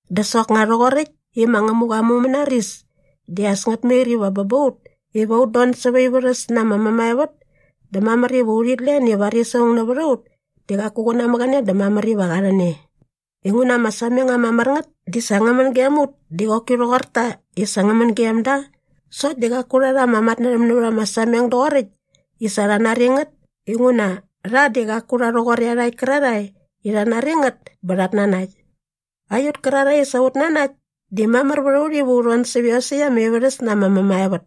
Dä soknga rhoqoräkt i ma Ngämuqa aa mumänaris di as ngät mair iva bä ba ut iva ut don säva aa ivärhäs na ama mämaevät dä mamär iva urhit len i varis aung nävät a ut di qaku qä namäqäne dä mamär iva qa rhän e. Inguna ama sameng ama mär ngät di sa ngä män gem ut di qoki rhoqor ta i sa ngä män gem da sokt di qaku rha rha ama matnärhäm nävät ama sameng doqoräkt i sa rha nari ngät inguna rha di qaku rha rhoqor iarhakt kärarhae i rhat nari ngät bä rhat nanakt. Aiut kärarhae i sa ut nanakt di mamär vät a ut iva ut don sävät iosäkt ama ivärhäs na ama mämaevät.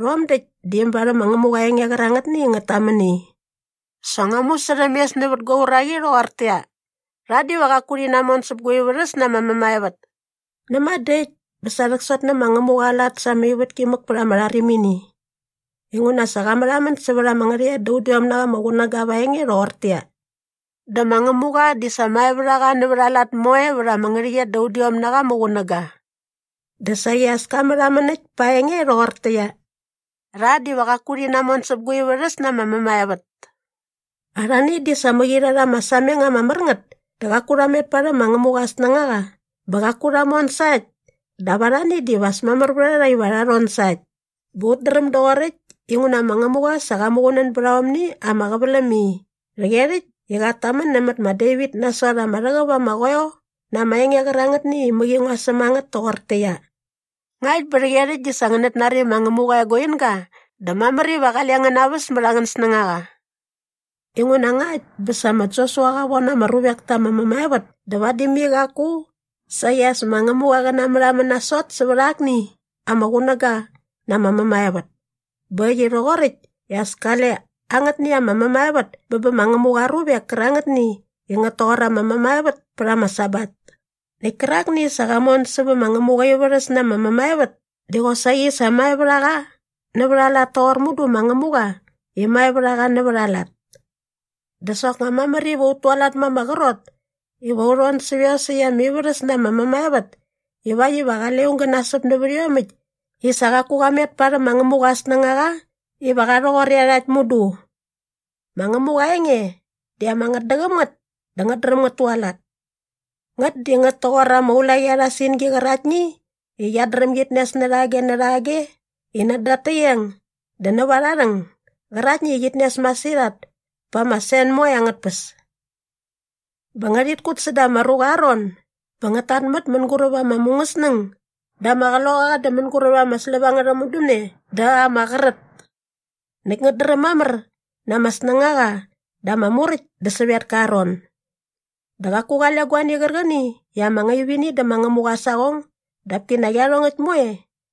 Rhom däkt di äm barhäm ma Ngämuqa aa enge qärangätni i ngät tamän i, “Sa ngua musärhämes nävät gua uraqi rhoqortäqyia, ‘Rha diva qaku rhi namon säp gua ivärhäs na ama mämaevät!’” näma dä äkt bä sa rhäksot nä ma Ngämuqa aa lat sa ama ivätki mäk pät ama rharimini. Inguna sa qa märhamän sävät ama ngärhäqyet da udiom na qa ama qunäga va aa enge rhoqortäqyia, “Dä ma Ngämuqa di sa mae vät a qa nävät aa lat moe vät ama ngärhäqyet da udiom na qa ama qunäga.” Dä saqi as ka märhamän äkt pa aa enge rhoqortäqyia, “Rha diva qaku rhi namon säp gua ivärhäs na ama mämaevät.” Arhani di sa mäqi rha rha ama sameng ama mär ngät dä qaku rha met parhäm ma Ngämuqa aa snängaqa bä qaku rha mon sa äkt dap arhani diva as mamär vät a rha iva rha rhon sa äkt bä ut dräm doqoräkt inguna ma Ngämuqa sa qa muqunän bät aomni ama qäväläm i “rhäqyerhäkt” i qat tamän nämät ma Devit nasot ama rhäqäp ama qoeo na ama enge qärangätni i mäqi ngua säm a ngät toqortäqyia, “Ngakt bä rhäqyerhäkt di sa ngänät nari ma Ngämuqa aa eguinga dä mamär iva qale ngän naväs mät angän snängaqa.” Inguna ngakt bä sa ma Josua qa von ama ruvek ta ama mämaevät dä vadi mai qaku saqi as ma Ngämuqa qä namärhamän nasot sävät akni ama qunäga na ama mämaevät. Bä äkt i rhoqoräkt dä as kale angätni ama mämaevät bä bä ma Ngämuqa aa ruvek kärangätni i ngät toqor aa mämaevät pät ama Sabat. Näkt kärakni i sa qa mon sävä ma Ngämuqa aa ivärhäs na ama mämaevät di qosaqi sa mae vät a qa nävät aa lat toqor mudu ma Ngämuqa i mae vät a qa nävät aa lat. Dä soknga mamär iva ut tualat ma ama qrot iva u rhon sävä iosäkt ama ivärhäs na ama mämaevät ivakt iva qale aung gä nasäp nävät iomäkt i sa qaku qa met parhäm ma Ngämuqa aa snängaqa iva qa rhoqor iarhakt mudu. Ma Ngämuqa aa enge di ama ngätdäqäm ngät dä ngät dräm ngät tualat. Ngät di ngät toqor ama ulaqi arha singi qäraktni i qiat dräm git nes närhage närhage i näda at täqeng dä näva arha rhäng gäraktni i qit nes masirhat pät ama sen moe angät tpäs. Bä ngärhit kut säda ama ruqa aa ron bä ngät tatmät mänguräp ama mungäsnäng dä ama qloqaqa dä mänguräp ama släp angärha mudämne dä ama qrät. Näkt ngät dräm mamär na ama snängaqa dä ama muräkt dä sävetka aa ron. Dä qaku qale guani qärqäni i ama ngaip ini dä ma Ngämuqa aa saqong dap kinak iarhongäkt moe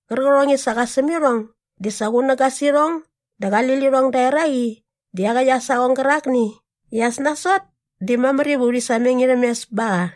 qärqärhong i sa qa säm irhong di sa qunäga sä irhong dä qali lirhong da eraqi dä iaqäkt aa saqong gärakni i as nasot di mamär iva urhi sameng irhäm mes ba qa.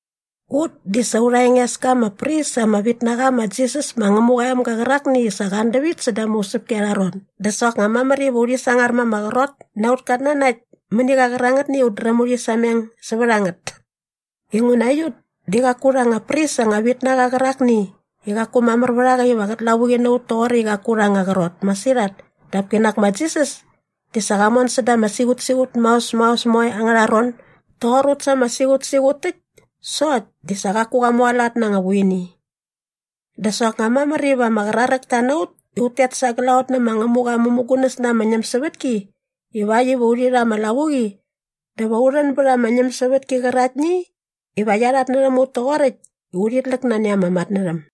Ut di sa aurha enges ka ama pris ama vit na qa ma Jisas ma Ngämuqa aa emga qärakni i sa qa an dävit säda ama usäpki arha ron dä soknga mamär iva urhi sangar ma ama qrot na aut katnanakt mäni qa qärangätni i ut dräm urhi sameng sävät a ngät. Inguna aiut di qaku aurha anga pris anga vit na qa qärakni i qaku mamär vät a qa iva qät lavuqi na ut toqoräkt i qaku aurha anga qrot masirhat dap kinak ma Jisas di sa qa mon säda ama siqutsiqut maos maos moe angärha ron doqor ut sa ama siqutsiqut täkt sokt di sa qaku qa mualat na anga vuini. Dä soknga mamär iva ama qraräkta na ut i ut tet sa glaqot nä ma Ngämuqa aa mämugunäs na ama ñämsävätki ivakt iva urhi rha ama lavuqi dä va u rhän bät ama ñämsävätki qäraktni iva qia rhatnärhäm ut toqoräkt i urhit läk nani ama matnärhäm.